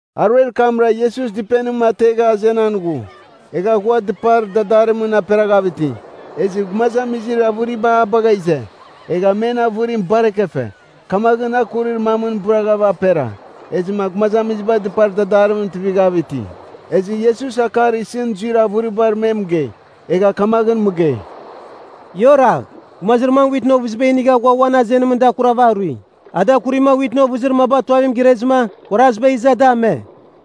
Aruer kamra Iesus dɨpenim ategha azenan ghu. Egha ghua dɨpar dadarimɨn aperaghav iti. Ezɨ gumazamizir avɨriba a bagha ize, egha men avɨrim bar ekefe. Kamaghɨn a kurir mamɨn bɨraghava apera. Ezɨma gumazamiziba dɨpar dadarimɨn tuivighav iti. Ezɨ Iesus akar isɨn zuir avɨribar me mɨgei. Egha kamaghɨn mɨgei, “Ia oragh. Gumazir mam witɨn ovɨziba inigha ghua uan azenimɨn da akurava arui. A da akurima witɨn ovɨzir maba tuavimɨn irezɨma, kuaraziba iza da ame.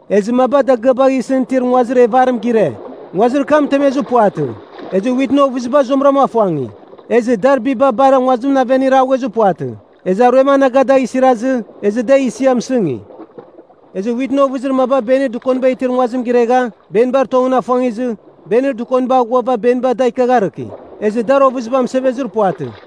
Ezɨ maba dagɨabagh isɨn itir nguazir evarim gire. Nguazir kam mɨtemezir puvatɨ, ezɨ witɨn ovɨziba zuamɨra afuangi. Ezɨ dar biba bar nguazimɨn aven iraghuezir puvatɨ, ezɨ aruem anaga dagh isirazɨ, ezɨ da isia mɨsɨngi. Ezɨ witɨn ovɨzir maba benir dɨkoniba itir nguazim giregha, benibar tongɨn afuangizɨ, benir dɨkoniba aghuava beniba da ikiagharɨki. Ezɨ dar ovɨziba mɨsevezir puvatɨ.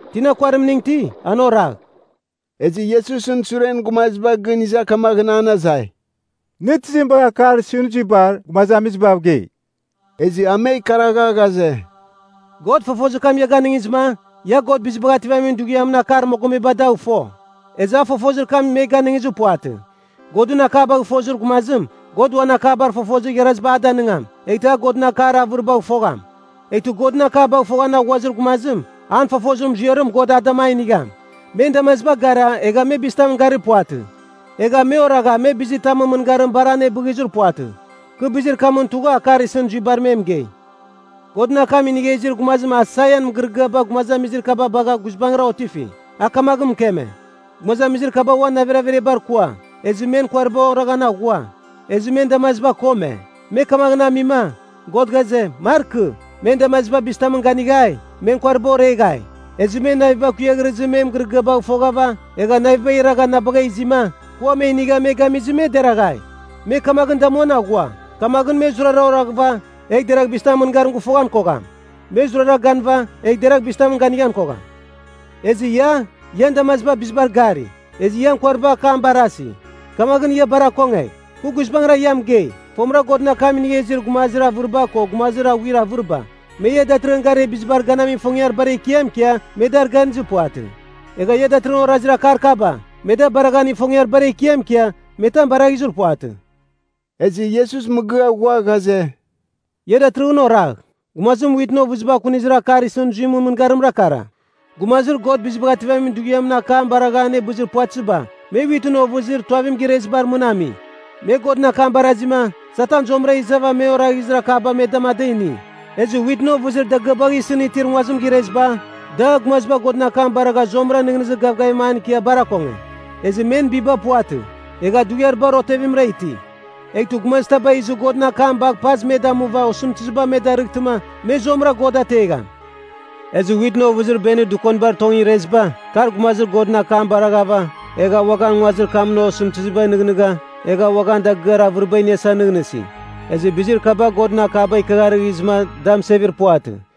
Tina kuarimning iti, an oragh.” Ezɨ Iesusɨn suren gumaziba gɨn iza kamaghɨn an azai, “Nɨ tizim bagha akar isɨn zuibar gumazamizibav gei?” Ezɨ a me ikaragha ghaze, “God fofozim ia ganɨngizɨma, ia God Bizibagh Ativamin Dughiamɨn akar mogomeba dagh fo. Ezɨ a fofozir kam me ganɨngizir puvatɨ. Godɨn akabagh fozir gumazim, God uan akabar fofozir igharaziba a danɨngam, eghtɨ a Godɨn akar avɨribagh fogham. Eghtɨ Godɨn akabagh foghan aghuazir gumazim, an fofozir muziarim God a dama inigham. Men damaziba gara, egha me bizitamɨn gari puvatɨ. Egha me oragha, me bizitamɨn mɨngarim bar anebɨghizir puvatɨ. Kɨ bizir kamɨn tugha akar isɨn zuibar me mɨgei. Godɨn akam inigha izir gumazim Aisaian mɨgɨrɨgɨaba gumazamizir kaba bagha guizbangɨra otifi. A kamaghɨn mɨkeme. ‘Gumazamizir kaba uan navir averiabar kua, ezɨ men kuariba oraghan aghua, ezɨ men damaziba kome. Me kamaghɨn amima, God ghaze, markɨ, men damaziba bizitamɨn ganighai, men kuariba oreghai. Ezɨ men naviba kuighrɨzɨma me mɨgɨrɨgɨabagh foghava egha navibagh iragha na bagha izima, kɨ ua me inigha me gamizɨma me deraghai. Me kamaghɨn damuan aghua, kamaghɨn me zurara oraghɨva, egh deragh bizitamɨn mɨngarim gɨfoghan kogham. Me zurara ganɨva, egh deragh bizitamɨn ganighan kogham.’ Ezɨ ia, ian damaziba bizibar gari, ezɨ ian kuariba akam barasi. Kamaghɨn ia bar akongegh! Kɨ guizbangɨra ia mɨgei, fomɨra Godɨn akam inigha izir gumazir avɨriba ko gumazir aghuir avɨriba, me ia datɨrɨghɨn garir bizibar ganamin ifongiar bar ekiam ikia, me dar ganizir puvatɨ. Egha ia datɨrɨghɨn orazir akar kaba, me da baraghan ifongiar bar ekiam ikia, me tam baraghizir puvatɨ.” Ezɨ Iesus mɨgɨa ghua ghaze, “Ia datɨrɨghɨn oragh, gumazim witɨn ovɨziba akunizir akar isɨn zuimɨn mɨngarimra kara. Gumazir God Bizibagh Ativamin Dughiamɨn akam baragha anebɨzir puvatɨziba, me witɨn ovɨzir tuavim girezibar mɨn ami. Me Godɨn akam barazima, Satan zuamɨra izava me oraghizir akaba me dama, da ini. Ezɨ witɨn ovɨzir dagɨabagh isɨn itir nguazim gireziba, da gumaziba Godɨn akam baragha zuamɨra nɨghnɨzir gavgavim an ikia bar akonge. Ezɨ men biba puvatɨ, egha dughiar bar otevimra iti. Eghtɨ gumazitaba izɨ Godɨn akam bagh pazɨ me damuva osɨmtɨziba me darɨghtɨma, me zuamɨra God ategham. Ezɨ witɨn ovɨzir benir dɨkonibar tongɨn ireziba, kar gumaziba Godɨn akam baraghava, egha uaghan nguazir kamɨn osɨmtɨzibagh nɨghnɨgha, egha uaghan dagɨar avɨriba iniasa nɨghnɨsi. Ezɨ bizir kaba Godɨn akaba ikiagharɨghizɨma da mɨsevir puvatɨ.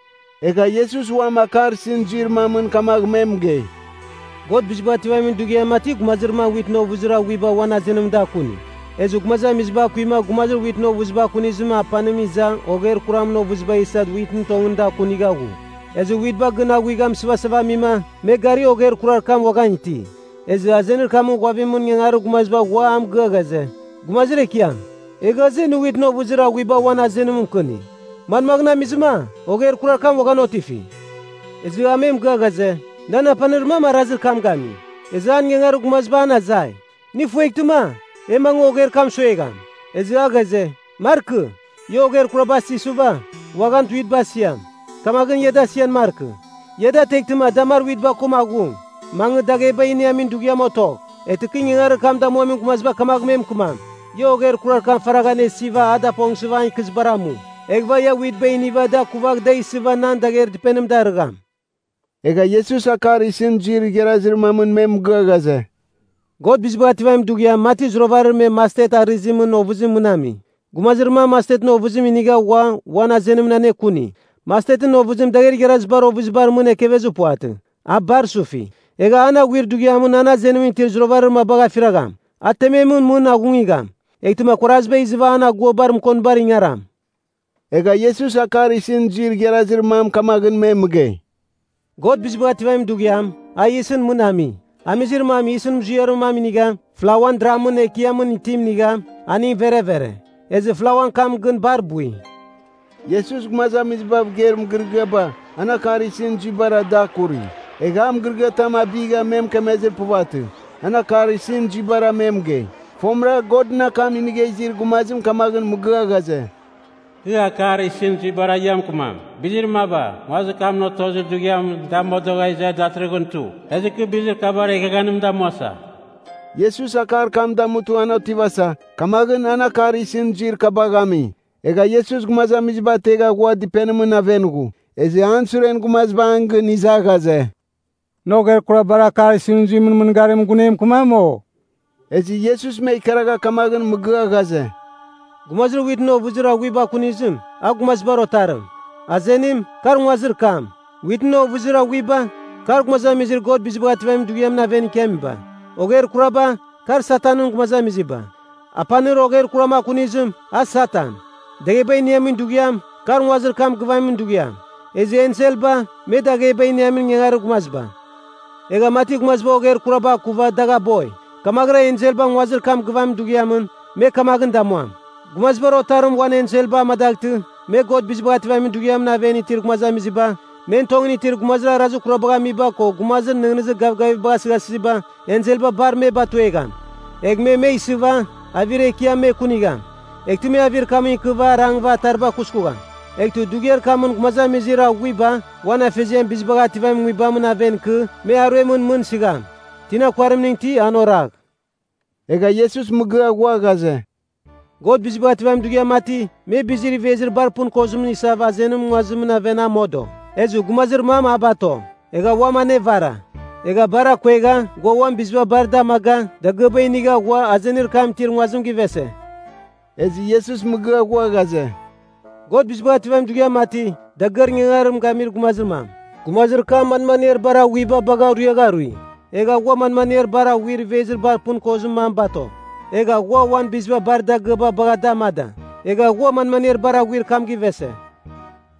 Egha Iesus uam akar isɨn zuir mamɨn kamagh me mɨgei, “God Bizibagh Ativamin Dughiam mati gumazir mam witɨn ovɨzir aghuiba uan azenimɨn da akuni. Ezɨ gumazamiziba akuima gumazir witɨn ovɨziba akunizimɨn apanim iza ogher kuramɨn ovɨziba isa witbar tongɨn da akunigha ghu. Ezɨ witba gɨn aguigha mɨsɨvasava amima, me gari ogher kurar kam uaghan iti. Ezɨ azenir kamɨn ghuavimɨn ingangarir gumaziba ghua a mɨgɨa ghaze, ‘Gumazir ekiam, e ghaze nɨ witɨn ovɨzir aghuiba uan azenim mɨkɨni. Manmagh amizɨma, ogher kurar kam uaghan otifi?’ “Ezɨ a me mɨgɨa ghaze, ‘Nan apanir mam arazir kam gami.’ Ezɨ an ingangarir gumaziba an azai, ‘Nɨ ifueghtɨma, e mangɨ ogher kam suagham?’ Ezɨ a ghaze, ‘Markɨ. Ia ogher kuraba asighsuva, uaghan witba asiam. Kamaghɨn da asian markɨ. Ia da ateghtɨma da mar witba ko aghung, mangɨ dagheba iniamin dughiamɨn otogh. Eghtɨ kɨ ingangarir kam damuamin gumaziba kamagh me mɨkɨmam, “Ia ogher kurar kam faragh anesɨva a dapongsɨva an ikɨzibar amu. Eghɨva ia witba iniva da akuvagh da isɨva nan dagher dɨpenim darɨgham.”’” Egha Iesus akar isɨn zuir igharazir mamɨn me mɨgɨa ghaze, “God Bizibagh Ativamin Dughiam mati zuravarir me mastet arɨzimɨn ovɨzimɨn mɨn ami. Gumazir mam mastetɨn ovɨzim inigha ghua uan azenimɨn anekuni. Mastetɨn ovɨzim dagher igharazibar ovɨzibar mɨn ekevezir puvatɨ. A bar sufi. Egha an aghuir dughiamɨn an azenimɨn itir zuravarir mabagh afiragham. A tememɨn mɨn aghungigham, eghtɨma kuaraziba izɨva an aguabar mɨkonibar ingaram.” Egha Iesus akar isɨn zuir igharazir mam kamaghɨn me mɨgei, “God Bizibagh Ativamin Dughiam, a yisɨn mɨn ami. Amizir mam yisɨn muziarir mam inigha, flauan dramɨn ekiamɨn itim inigha, aning verevere. Ezɨ flauan kam gɨn bar bui.” Iesus gumazamizibav geir mɨgɨrɨgɨaba, an akar isɨn zuibara da akuri. Egha a mɨgɨrɨgɨatam abigha me mɨkemezir puvatɨ, an akar isɨn zuibara me mɨgei. Fomɨra Godɨn akam inigha izir gumazim kamagh mɨgɨa ghaze, “Kɨ akar isɨn zuibara ia mɨkɨmam. Bizir maba, nguazir kam otozir dughiamɨn da modogha iza datɨrɨghɨn tu, ezɨ kɨ bizir kabar eghaghanim damuasa.” Iesus akar kam damutɨ an otivasa, kamaghɨn an akar isɨn zuir kabagh ami. Egha Iesus gumazamiziba ategha ghua dɨpenimɨn aven ghu. Ezɨ an suren gumaziba an gɨn iza ghaze, “Nɨ ogher kurabar akar isɨn zuimɨn mɨngarimɨn gun e mɨkɨmam, o?” Ezɨ Iesus me ikaragha kamaghɨn mɨgɨa ghaze, “Gumazir witɨn ovɨzir aghuiba akunizim, a Gumazibar Otarim. Azenim, kar nguazir kam. Witɨn ovɨzir aghuiba, kar gumazamizir God Bizibagh Ativamin Dughiamɨn aven ikiamiba. Ogher kuraba, kar Satanɨn gumazamiziba. Apanir ogher kuram akunizim, a Satan. Dagheba iniamin dughiam, kar nguazir kam gɨvamin dughiam. Ezɨ enselba, me dagheba iniamin ingangarir gumaziba. Egha mati gumaziba ogher kuraba akuva dagh aboi, kamaghɨra enselba nguazir kam gɨvamin dughiamɨn, me kamaghɨn damuam. Gumazibar Otarim uan enselba amadaghtɨ, me God Bizibagh Ativamin Dughiamɨn aven itir gumazamiziba, men tongɨn itir gumazir arazir kurabagh amiba ko gumazir nɨghnɨzir gavgavibagh asɨghasɨziba, enselba bar me batuegham. Egh me me isɨva, avir ekiam me kunigham. Eghtɨ me avir kamɨn ikɨva arangɨva atariba kuskugham. Eghtɨ dughiar kamɨn gumazamizir aghuiba uan Afeziam Bizibagh Ativamin Nguibamɨn aven ikɨ, me aruemɨn mɨn sɨgham. Tina kuarimning iti, an oragh.” Egha Iesus mɨgɨa ghua ghaze, “God Bizibagh Ativamin Dughiam mati, me bizir ivezir bar pɨn kozim isava azenimɨn nguazimɨn aven a modo. Ezɨ gumazir mam a bato, egha uam anevara. Egha bar akuegha, ghua uan biziba bar da amaga, dagɨaba inigha ghua, azenir kam itir nguazim givese.” Ezɨ Iesus mɨgɨa ghua ghaze, “God Bizibagh Ativamin Dughiam mati, dagɨar ingangarim gamir gumazir mam. Gumazir kam manmaniar bar aghuiba bagha ruiagha arui. Egha ghua manmaniar bar aghuir ivezir bar pɨn kozir mam bato. Egha ghua uan biziba bar dagɨaba bagha da amada. Egha ghua manmaniar bar aghuir kam givese.”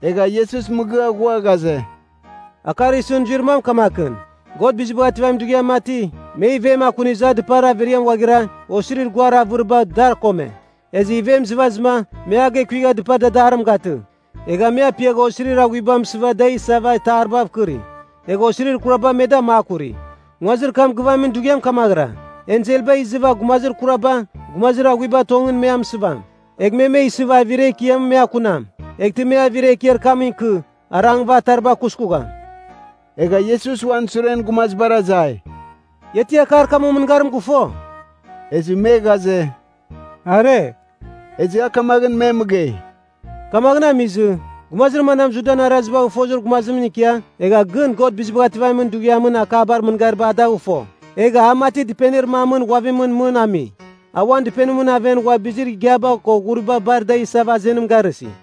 Egha Iesus mɨgɨa ghua ghaze, “Akar isɨn zuir mam kamakɨn. God Bizibagh Ativamin Dughiam mati, me ivem akunizɨ a dɨpar averiamɨn ghuaghira, osirir guar avɨriba, dar akome. Ezɨ ivem izɨvazɨma, me a gekuigha dɨpar dadarim gatɨ. Egha me apiagha osirir aghuiba mɨsɨva da isava itaribav kɨri. Egha osirir kuraba me da makuri. Nguazir kam gɨvamin dughiam kamaghɨra. Enselba izɨva gumazir kuraba, gumazir aghuibar tongɨn me amɨsɨvam. Egh me me isɨva, avir ekiamɨn me akunam. Eghtɨ me avir ekiar kamɨn ikɨ, arangɨva atariba kuskugham.” Egha Iesus uan suren gumazibar azai, “Ia ti akar kamɨn mɨngarim gɨfo?” Ezɨ me ghaze, “Are.” Ezɨ a kamaghɨn me mɨgei, “Kamaghɨn amizɨ, gumazir manam Judan arazibagh fozir gumazimɨn ikia, egha gɨn God Bizibagh Ativamin Dughiamɨn akabar mɨngariba a dagh fo, egha a mati dɨpenir mamɨn ghuavimɨn mɨn ami. A uan dɨpenimɨn aven ghua bizir igiaba ko ghuriba bar da isava azenim garɨsi.”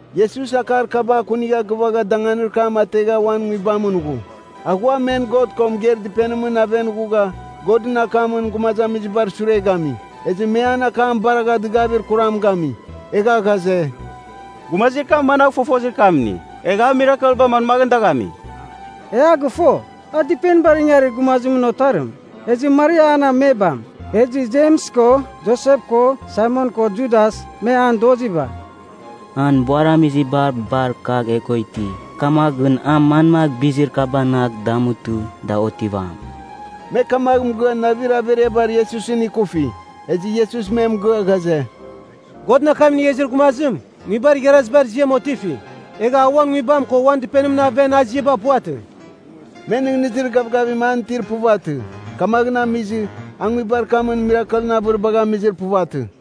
Iesus akar kaba akunigha gɨvagha danganir kam ategha uan nguibamɨn ghu. A ghua men God ko mɨgeir dɨpenimɨn aven ghugha, Godɨn akamɨn gumazamizibar sure gami. Ezɨ me an akam baragha dɨgavir kuram gami. Egha ghaze, “Gumazir kam managh fofozir kam ini? Egha a mirakelba manmaghɨn dagh ami? E a gɨfo, a dɨpenibar ingarir gumazimɨn otarim, ezɨ Maria an amebam. Ezɨ Jems ko Josep ko Saimon ko Judas, me an doziba. An buaramiziba bar kagh e ko iti. Kamaghɨn a manmagh bizir kabanagh damutɨ, da otivam.” Me kamagh mɨgɨa navir averiaba Iesusɨn ikufi. Ezɨ Iesus me mɨgɨa ghaze, “Godɨn akam inigha izir gumazim, nguibar igharazibar ziam otifi. Egha a uan nguibam ko uan dɨpenimɨn aven, a ziaba puvatɨ.” Me nɨghnɨzir gavgavim an itir puvatɨ, kamaghɨn amizɨ, a nguibar kamɨn mirakelɨn avɨribagh amizir puvatɨ.